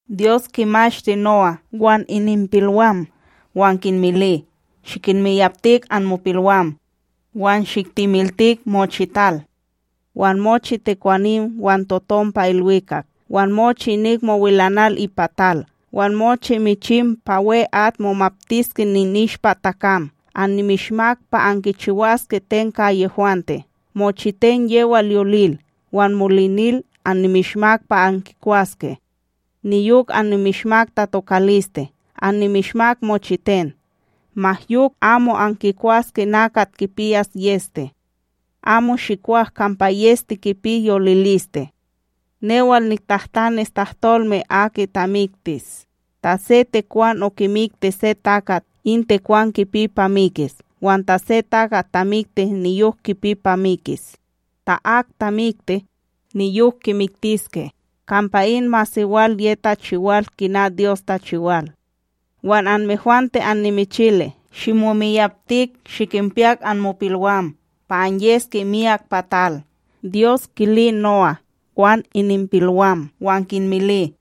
Dyos kimashti No'á wan ininpilwam wan kinmili: “Shikinmiyapti anmopilwam, wan shiktemiltik pa mochital. Wan mochi tekwanim wan totom pa ilwikak wan mochi inik mowilanal ipa tal wan mochi michim pa we'at momaptiske ininishpa takam. Annimishmak pa ankichiwaske ten ka yehwante. Mochiten yewal yolil wan molinil, annimishmak pa ankikwaske. Niyok annimishmak tatokaliste. Annimishmak mochiten. Ma yok, amo ankikwaske nakat kipiyas yEste, amo shikwak kampa yEste kipi yoliliste. Newal niktahtanis tahtolme aki tamiktis, ta se tekwan okimikti se takat, in tekwan kipi pa mikis wan ta se takat tamikti niyok kipi pa mikis. ”Ta ak tamikti, niyok kimiktiske, kampa in masewal ye tachiwal kina Dyos tachiwal. “Wan anmehwante annimichilis, shimomiyaptik shikinpiyak anmopilwam pa anyeske myak pa tal.” Dyos kili No'á wan ininpilwam, wan kinmili: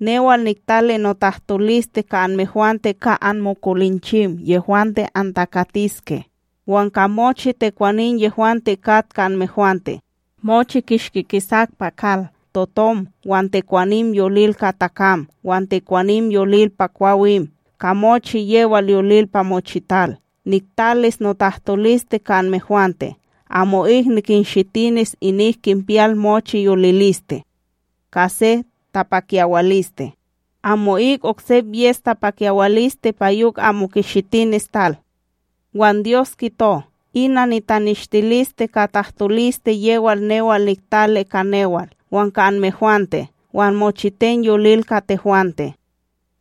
“Newal niktali notahtoliste ka anmehwante, ka anmokolinchim yehwante antakatiske, wan ka mochi tekwanim yehwante kat ka anmehwante, mochi kishki kisak pa kal: totom, wan tekwanim yolil ka takam wan tekwanim yolil pa kwawim ka mochi yewal yolil pa mochital. Niktalis notahtoliste ka anmehwante: amo'ik nikinshitinis inik kinpiyal mochi yoliliste ka se tapakyawaliste; amo'ik oksep yes tapakyawaliste pa yok amo kishitinis tal.” Wan Dyos kito: “Ina nitaneshtiliste ka tahtoliste yewal newal niktali ka newal wan ka anmehwante wan mochiten yolil ka tehwante: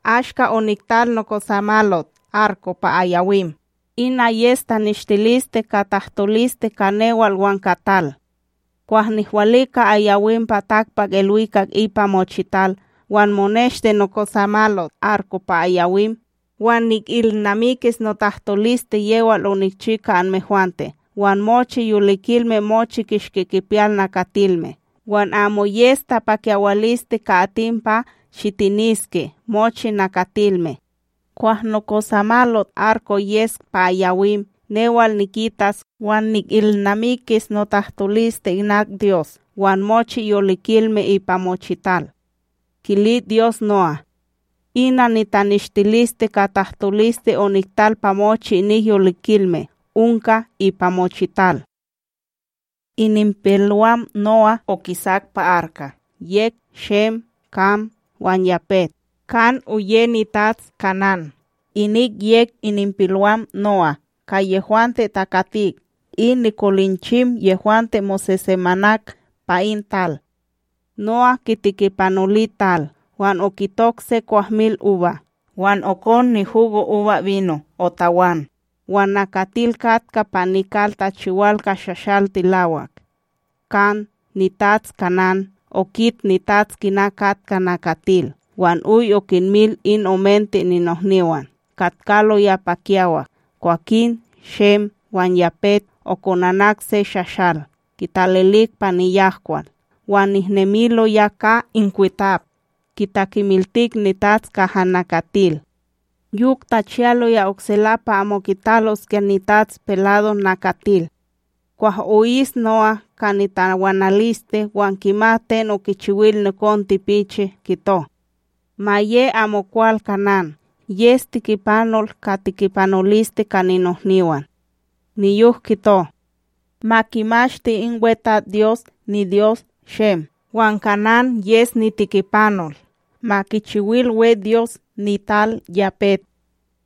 Ashka oniktal nokosamalot arko pa ayawim, ina yes taneshtiliste ka tahtoliste ka newal wan ka tal. Kwah nihwalika ayawim pa takpakIlwikak ipa mochital, wan moneshti nokosamalot arko pa ayawim, wan nikilnamikis notahtoliste yewal onikchi ka anmehwante wan mochi yolikilme mochi kishki kipiyal nakatilme. Wan amo yes tapakyawaliste ka atim pa shitiniske mochi nakatilme. Kwah nokosamalot arko yes pa ayawim, newal nikitas wan nikilnamikis notahtoliste inak Dyos wan mochi yolikilme ipa mochital.” Kili Dyos No'á: “Ina nitaneshtiliste ka tahtoliste oniktal pa mochi inik yolinilme onka ipa mochital.” Ininpilwam No'á okisak pa arka yek Shem, Kam wan Yapet. Kam, oye nitats Kanán. Inik yek ininpilwam No'á ka yehwante takatik in nikolinchim yehwante mosesemanak pa in tal. No'á kitikipanoli tal, wan okitok se kwahmilUba. Wan okon nihugoUbaBino otawan, wan nakatil katka pa nikal tachiwal ka shashal tilawak. Kam, nitats Kanán, okit nitats kina katka nakatil wan oy okinmil in omente ninohniwan, katkaloya pa kiyawak. Kwakin Shem wan Yapet okonanak se shashal, kitalilik pa niyahkwal, wan nehnemiloya ka inkwitap, kitakemiltik nitats kaha nakatil. Yok tachiyaloya oksela, pa amo kitaloskya nitats pelado nakatil. Kwah o'is No'á ka nitawanaliste wan kimat ten okichiwil nikon tipichi, kito: “Ma ye amokwal Kanán! Yes tikipanol ka tikipanoliste ka ninohniwan.” Niyok kito: “Ma kimashti in WeTatsDyos, niDyos Shem! Wan Kanán yes nitikipanol! Ma kichiwil we Dyos nital Yapet!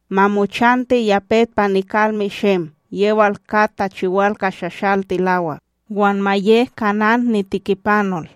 Ma mochanti Yapet pa nikalme Shem yewal kat tachiwal ka shashal tilawak, wan ma ye Kanán nitikipanol!”